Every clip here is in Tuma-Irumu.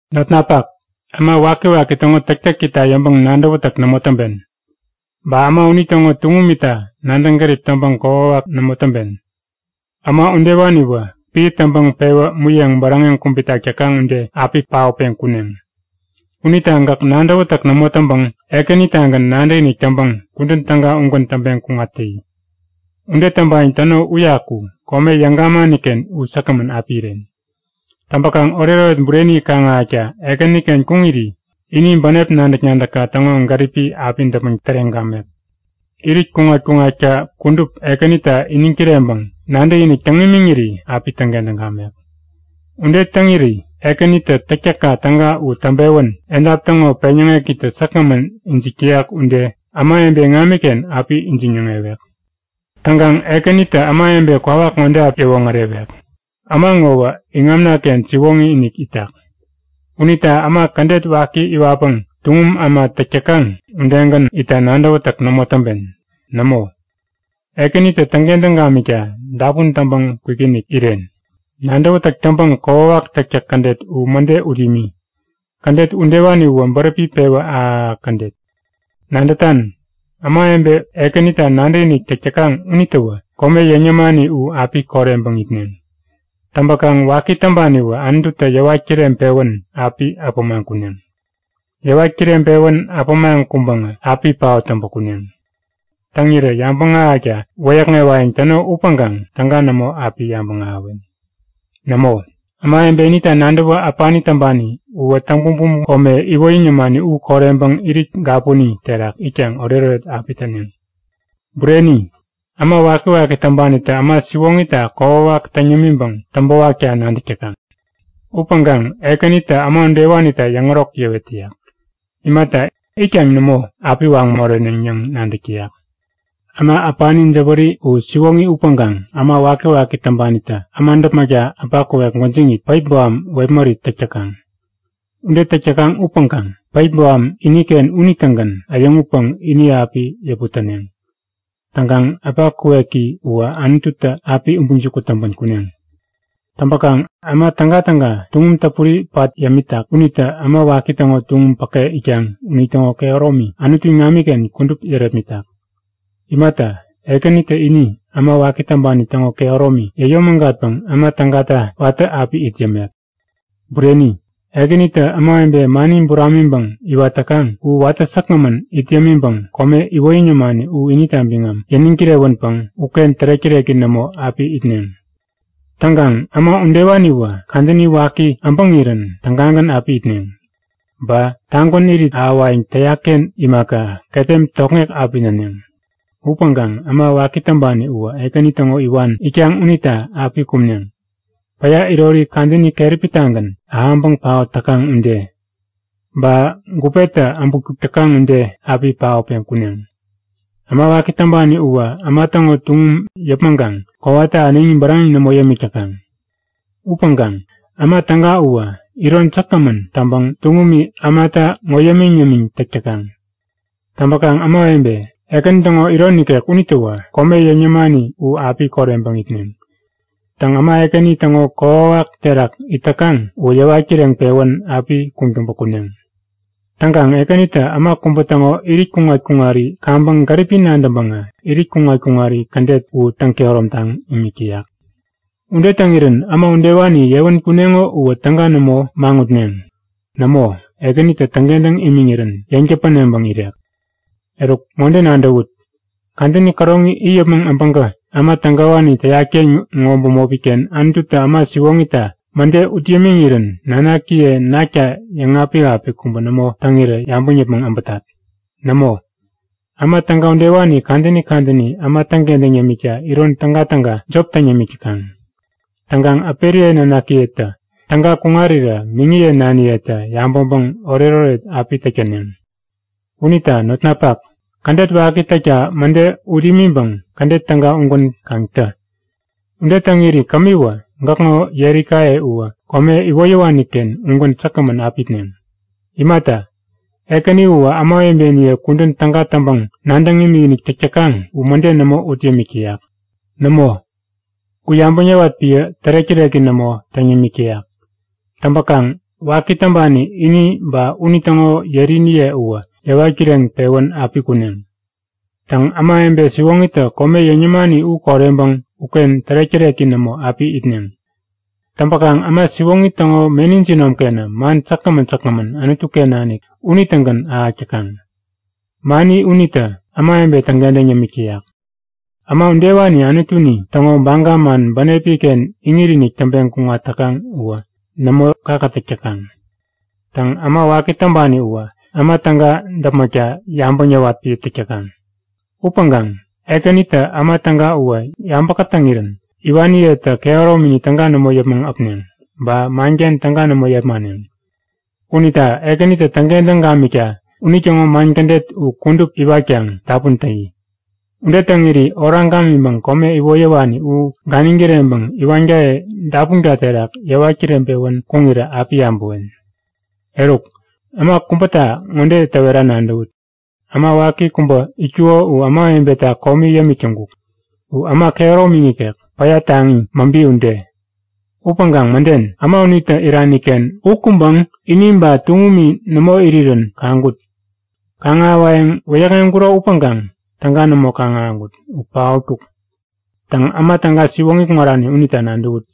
Notnapak, äma wakiwaki täŋo täktäkita yäŋpäŋ nadäwätäk nämo täŋpen. Ba äma unitäŋo tuŋumita nadäŋ gärip täŋpäŋ kokwawak nämo täŋpen. Äma udewaniwä piä täŋpäŋ pewä muyeŋ bäräŋeŋ kubitak täkaŋ ude api paotpeŋ kuneŋ. Unita gäk nadäwätäk nämo täŋpäŋ Ekänitagän nadäkinik täŋpäŋ kudän täga ugän täŋpeŋ kuŋat täyi. Ude täŋpayäŋ täno uyaku kome yäŋ gamaniken u säkgämän api iren. Täŋpäkaŋ oretoret bureni kaŋ-ahäkta Ekäniken kuŋiri ini bänep nadäk-nadäkka täŋo gäripi api däpmäŋ täreŋ gamek. Irit kuŋat-kuŋatka kudup Ekänita iniŋ kireŋpäŋ nadäkinik täŋ imiŋiri api täŋkentäŋ gamek. Ude täŋiri Ekänitä täktäkka täga u täŋpewän edap täŋo peŋyäŋekitä säkgämän ijik täyak ude ämawebe iŋamiken api ijiŋ-yäŋewek. Täŋkaŋ Ekänitä ämawebe kwawak ŋode api yäwoŋärewek; Äma ŋowä iŋamnaken siwoŋi-inik itak. Unita äma kädet waki iwatpäŋ tuŋum äma täk täkaŋ udegän itta nadäwätäk nämo täŋpen. Nämo, Ekänitä täŋkentäŋ gamikta dapun täŋpäŋ kwikinik iren. Nadäwätäk täŋpäŋ kokwawak täktäk kädet u mäde ut imi. Kädet udewani uwä bäräpi pewä ahäk-ahäk kädet. Nadätan? Ämawebe Ekänita nadäkinik täk täkaŋ unitäwä kome yäŋ yämani u api koreŋpäŋ itneŋ. Täŋpäkaŋ waki täŋpaniwä Anututä yäwat kireŋpewän api apämaŋ kuneŋ. Yäwat kireŋpewän apämaŋ kuŋpäŋä api paot täŋpä kuneŋ. Täŋirä yabäŋ ahäkta wäyäkŋewayäŋ täno upäŋkaŋ täga nämo api yabäŋ ahäwen. Nämo! Ämawebe inita nadäwä äpani täŋpani uwä täŋ-bumbum kome iwoyäŋ yämani u koreŋpäŋ irit gapuni terak itkaŋ oretoret api täneŋ. Bureni, äma wakiwaki täŋpanitä äma siwoŋita kokwawak täŋ yämiŋpäŋ täŋpäwakta nadäk täkaŋ. Upäŋkaŋ Ekänitä äma udewanita yäŋärok yäwet täyak. Imata, itkaŋ nämo, api waŋ moreneŋ yäŋ nadäk täyak. Äma äpani jäwäri u siwoŋi upäŋkaŋ äma wakiwaki täŋpanitä äma däpmäkta äpa kuwek gwäjiŋit päip boham wepmärit täk täkaŋ. Ude täk täkaŋ upäŋkaŋ päip boham iniken unitägän äyäŋutpäŋ ini api yäput täneŋ. Täŋkaŋ äpa kuweki uwä Anututä api ubiŋ jukut täŋpän kuneŋ. Täŋpäkaŋ äma tägatäga tuŋum täpuri pat yämitak unitä äma waki täŋo tuŋum päke itkaŋ unitäŋo kehäromi Anutu iŋamiken kudup yärepmitak. Imata, Ekänitä ini äma waki täŋpani täŋo kehäromi yäyomägatpäŋ äma tägata watä api it yämek. Bureni, Ekänitä ämawebe mani buramiŋpäŋ iwat täkaŋ u watä säkgämän it yämiŋpäŋ kome iwoyäŋ yämani u inita biŋam yäniŋ kirewänpäŋ uken tärek-täreki nämo api itneŋ. Täŋkaŋ äma udewaniwä kadäni waki äbäŋirän tägagän api itneŋ. Ba tagwän irit ahäwayäŋ täyakken imaka, ketem tokŋek api näneŋ. Upäŋkaŋ äma waki täŋpani uwä Ekäni täŋo iwan itkaŋ unita api kumneŋ. Päya irori kadäni keräpitagän ahäŋpäŋ paot täkaŋ ude, ba gupetä äbutkuk täkaŋ ude api paotpeŋ kuneŋ. Äma waki täŋpani uwä äma täŋo tuŋum yäpmäŋkaŋ kowata äneŋi bäräŋeŋ nämo yämik täkaŋ. Upäŋkaŋ äma täga uwä iron säkgämän täŋpäŋ tuŋumi ämata ŋo yämiŋ-yämiŋ täk täkaŋ. Täŋpäkaŋ ämawebe Ekäni täŋo iron ikek unitäwä kome yäŋ yämani u api koreŋpäŋ itneŋ. Täŋ äma Ekäni täŋo kokwawak terak it täkaŋ uwä yäwat kireŋpewän api kuŋtäŋpä kuneŋ. Täŋkaŋ Ekänitä äma kubä täŋo irit kuŋat-kuŋari kaŋpäŋ gäripi nadäŋpäŋä irit kuŋat-kuŋari kädet u täŋ-kehäromtaŋ imik täyak. Ude täŋirän äma udewani yewän kuneŋo uwä täga nämo maŋutneŋ. Nämo, Ekänitä täŋkentäŋ imiŋirän yeŋ täpäneŋpäŋ irek. Eruk, ŋode nadäwut; Kadäni käroŋi it yäpmäŋ äbäŋkä äma tägawani täyatken ŋo bämopiken Anututä äma siwoŋita mäde ut yämiŋirän nanakiye nakta yäŋapik-apik kubä nämo täŋirä yabäŋ yäpmäŋ äbätat. Nämo, äma täga udewani kadäni kadäni äma täŋkentäŋ yämikta iron tägatäga jop täŋ yämik täkaŋ. Täŋkaŋ äperiye nanakiyetä täga kuŋarirä miŋiye naniyetä yabäŋpäŋ oretoret api täk täneŋ. Unita notnapak, kädet waki täkta mäde ut imiŋpäŋ kädet täga ugän kaŋ tä. Ude täŋiri kämiwä gäkŋo yerikaye uwä kome iwoyäwaniken ugän säkgämän api itneŋ. Imata, Ekäni uwä ämawebeniye kudän täga täŋpäŋ nadäŋ imikinik täk täkaŋ u mäde nämo ut yämik täyak. Nämo, u yabäŋ yäwat piä tärek-täreki nämo täŋ yämik täyak. Täŋpäkaŋ waki täŋpani ini ba unitäŋo yeriniye uwä yäwat kireŋpewän api kuneŋ. Täŋ ämawebe siwoŋitä kome yäŋ yämani u koreŋpäŋ uken tärek-täreki nämo api itneŋ. Täŋpäkaŋ äma siwoŋi täŋo meni jinomkenä man säkgämän säkgämän Anutuken nanik unitägän ahäk täkaŋ. Mani unitä ämawebe täŋkentäŋ yämik täyak. Äma udewani Anutuni täŋo baga man bänepiken iŋit-inik täŋpeŋ kuŋat täkaŋ uwä nämo kakätäk täkaŋ. Täŋ äma waki täŋpani uwä äma täga däpmäkta yabäŋ yäwat piä täk täkaŋ. Upäŋkaŋ Ekänitä äma täga uwä yabä kätäŋirän iwaniyetä kehäromini täga nämo yäpmäŋ äpneŋ, ba manken täga nämo yepmaneŋ. Unita Ekänitä täŋkentäŋ gamikta unitäŋo man kädet u kudup iwatkaŋ dapun täyi. Ude täŋiri oraŋ gamiŋpäŋ kome iwoyäwani u ganiŋ kireŋpäŋ iwankaye dapunka terak yäwat kireŋpewän kuŋirä api yabäwen. Eruk, äma kubäta ŋode täwera nadäwut; Äma waki kubä itkuko u ämawebeta komi yämik täŋkuk. U äma kehäromini nikek, päya taŋi, mäbi ude. Upäŋkaŋ mäden, äma unitä iraniken u kuŋpäŋ ini ba tuŋumi nämo irirän kaŋkut. Kaŋ-ahäwayäŋ wäyäkŋeŋkuro upäŋkaŋ täga nämo kaŋ-ahäŋkut. U paotkuk. Täŋ äma täga siwoŋi kuŋarani unita nadäwut;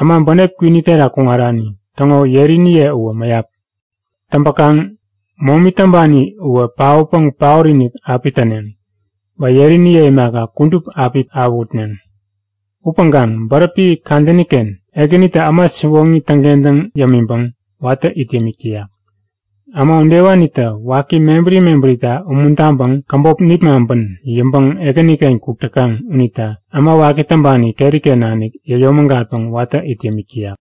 Äma bänep kwini terak kuŋarani täŋo yeriniye uwä mäyap. Täŋpäkaŋ momi täŋpani uwä paotpäŋ paot-inik api täneŋ. Ba yeriniye imaka, kudup api awähutneŋ. Upäŋkaŋ bäräpi kadäniken Ekänitä äma siwoŋi täŋkentäŋ yämiŋpäŋ watä it yämik täyak. Äma udewanitä waki mebäri mebärita umuntaŋpäŋ käbop nipmaŋpän yäŋpäŋ Ekäniken kuk täkaŋ unita äma waki täŋpani keriken nanik yäyomägatpäŋ watä it yämik täyak.